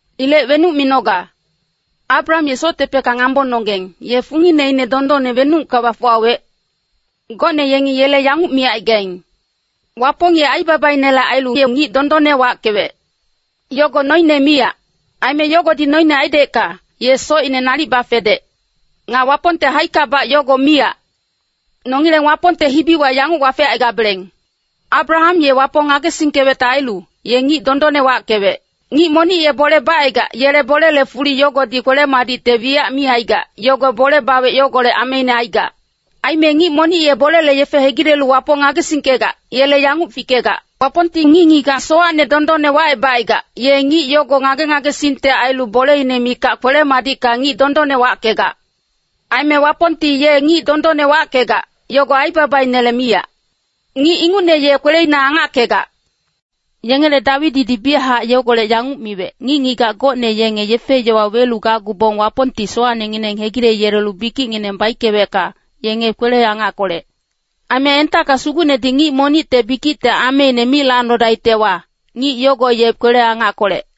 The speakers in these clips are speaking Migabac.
Ilec wenuc minoga? Abraham ye soctepecka ngambononggeng, ye fungineine dondonne wenucka bafuwawec? Gocne yengi yele yanguc micaigaing, “Wapong ye aibabainele ailu ye ngic dondonne wackewec.” Yogo noine miyac. Aime yogodi noine aidecka, ye socine nalic bafedec. Nga Wapongte haickabac yogo miyac. Nongileng Wapongte hibiwa yanguc wafecaigabeleng, “Abraham ye Wapong ngagesingkewecte ailu, ye ngic dondonne wackewec.” Ngic monic ye bole bacaigac, yele bolele fuli yogodi kwele-madicte wiyac mi aigac, yogo bole bawec yogolec ameine aigac. Aime ngic monic ye bolele yefe hegilelu Wapong ngagesingkegac, yele yanguc fikegac. Wapongti ngic-ngigac sowacne dondonne wacebacaigac, ye ngic yogo ngage-ngagesingte ailu boleine mikac kwele-madicka ngic dondonne wackegac. Aime Wapongti ye ngic dondonne wackegac, yogo aibabainele miyac. Ngic ingucne ye kweleina angackegac. Yengele Dawididi biyachac yogolec yanguc miwec, “Ngic-ngigac gocne yenge yefe-yowa welu gacgubong Wapongti sowacnengineng hegileyelelu bikicngineng baickewecka, yenge kwele-angackolec. Aime entacka Sugucnedi ngic monicte bikicte ameine mi lacnodaictewa, ngic yogo ye kwele-angackolec.”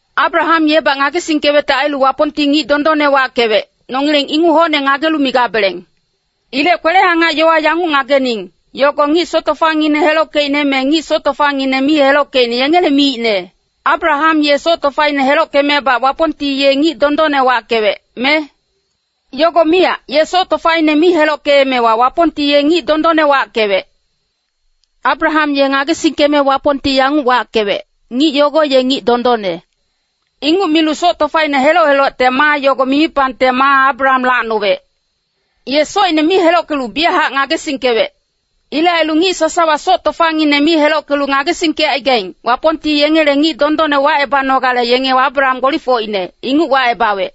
Abraham yebac ngagesingkewecte ailu Wapongti ngic dondonne wackewec, nongileng inguc hocne ngagelu migabeleng. Ilec kwele-angac yowa yanguc ngagening, yogo ngic soc tofangineng helockeicne me ngic soc tofangineng mi helockeicne yengele miicne? Abraham ye soc tofaine helockemebac Wapongti ye ngic dondonne wackewec, me? Yogo miyac, ye soc tofaine mi helockeemewa Wapongti ye ngic dondonne wackewec. Abraham ye ngagesingkeme Wapongti yanguc wackewec, “Ngic yogo ye ngic dondonne.” Inguc milu soc tofaine heloc-helocte maa yogo mimipangte maa Abraham lacnowec. Ye socine mi helockelu biyachac ngagesingkewec. Ilec ailu ngic sasawa soc tofangineng mi helockelu ngagesingkecaigaing, Wapongti yengele ngic dondonne wacebanogale yenge Abraham gbolifocine, inguc wacebawec.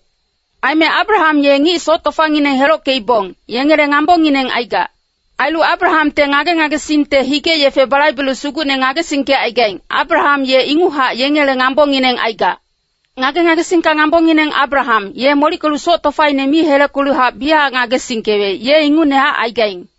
Aime Abraham ye ngic soc tofangineng helockeibong, yengele ngambongineng aigac. Ailu Abrahamte ngage-ngagesingte hige-yefe balaibelu Sugucne ngagesingkecaigaing, Abraham ye inguchac yengele ngambongineng aigac. Ngage-ngagesingka ngambongineng Abraham, ye molickelu soc tofaine mi helockeluhac biyachac ngagesingkewec, ye ingucnehac aigaing.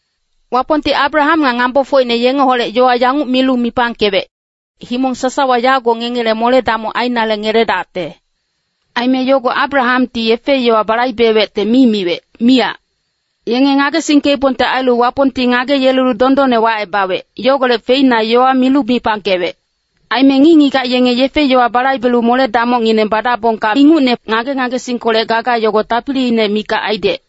Wapongti Abraham nga ngambofocine yengeholec yowa yanguc milu mipangkewec, “Himong sasawa yago ngengele mole-damoc ainale ngeledacte.” Aime yogo Abrahamti yefe-yowa balaibewecte mi miwec, miyac. Yenge ngagesingkeibongte ailu Wapongti ngageyelelu dondonne wacebawec, yogolec feina yowa milu mipangkewec. Aime ngic-ngigac yenge yefe-yowa balaibelu mole-damocngineng badabongka ingucne, ngage-ngagesingkolec gaga yogo tapiliine mikac aidec.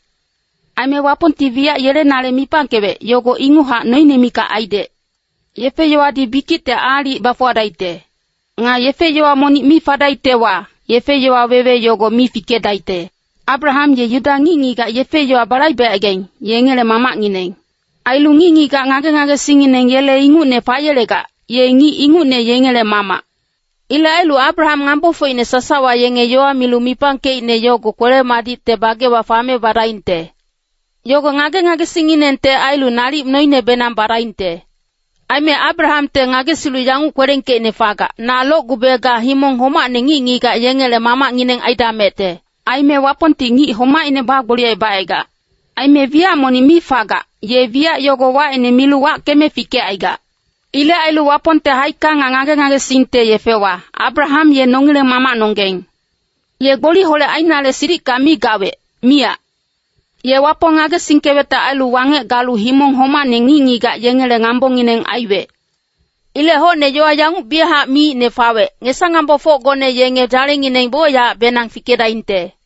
Aime Wapongti wiyac yelenale mipangkewec, yogo inguchac noine mikac aidec. Yefe-yowadi bikicte aalic bafuwadaicte. Nga yefe-yowa monic mi fadaictewa, yefe-yowa wewe yogo mi fikedaicte. Abraham ye Yuda ngic-ngigac yefe-yowa balaibecaigaing, yengele mamacngineng. Ailu ngic-ngigac ngage-ngagesingngineng yele ingucne fayelegac, ye ngic ingucne yengele mamac. Ilec ailu Abraham ngambofocine sasawa yenge yowa milu mipangkeicne yogo kwele-madicte bagewa fame badaingte. Yogo ngage-ngagesingnginengte ailu nalic noinebenang badaingte. Aime Abrahamte ngagesilu yanguc kwelengkeicne fagac, “Na locgube ga himong homacne ngic-ngigac yengele mamacngineng aidamecte.” Aime Wapongti ngic homaicne bagboliyecebacaigac. Aime wiyac monic mi fagac, ye wiyac yogo wacine milu wackeme fikecaigac. Ilec ailu Wapongte haicka nga ngage-ngagesingte yefewa, Abraham ye nongileng mamacnonggeng. Ye gboliholec ainale silicka mi gawec, miyac. Ye Wapong ngagesingkewecte ailu wangec galu himong homacne ngic-ngigac yengele ngambongineng aiwec. Ilec hocne yowa yanguc biyachac miicne fawec, “Ngesa-ngambofocgone yenge dzalengineng bocyacbenang fikedaingte.”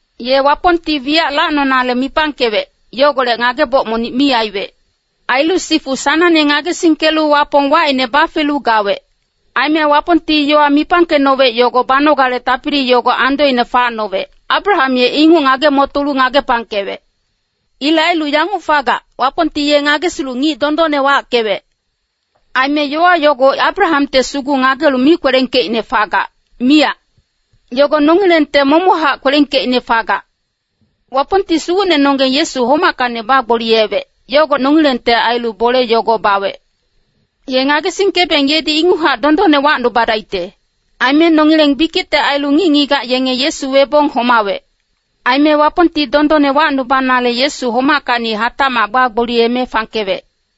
Ye Wapongti wiyac lacnonale mipangkewec, yogolec ngageboc monic mi aiwec. Ailu sifu sanangne ngagesingkelu Wapong wacine bafelu gawec. Aime Wapongti yowa mipangkecnowec yogo banogale tapili yogo andoine facnowec, Abraham ye inguc ngage-motolu ngagepangkewec. Ilec ailu yanguc fagac, “Wapongti ye ngagesilu ngic dondonne wackewec.” Aime yowa yogo Abrahamte sugu ngagelu mi kwelengkeicne fagac, miyac. Yogo nongilengte momochac kwelengkeicne fagac. Wapongti Sugucnenonggeng Yesu homackacni bagboliyewec, yogo nongilengte ailu bole yogo bawec. Ye ngagesingkebeng yedi inguchac dondonne wacnubadaicte. Aime nongileng bikicte ailu ngic-ngigac yenge Yesu webong homawec. Aime Wapongti dondonne wacnubanale Yesu homackacni hatacmac bagboliyeme fangkewec.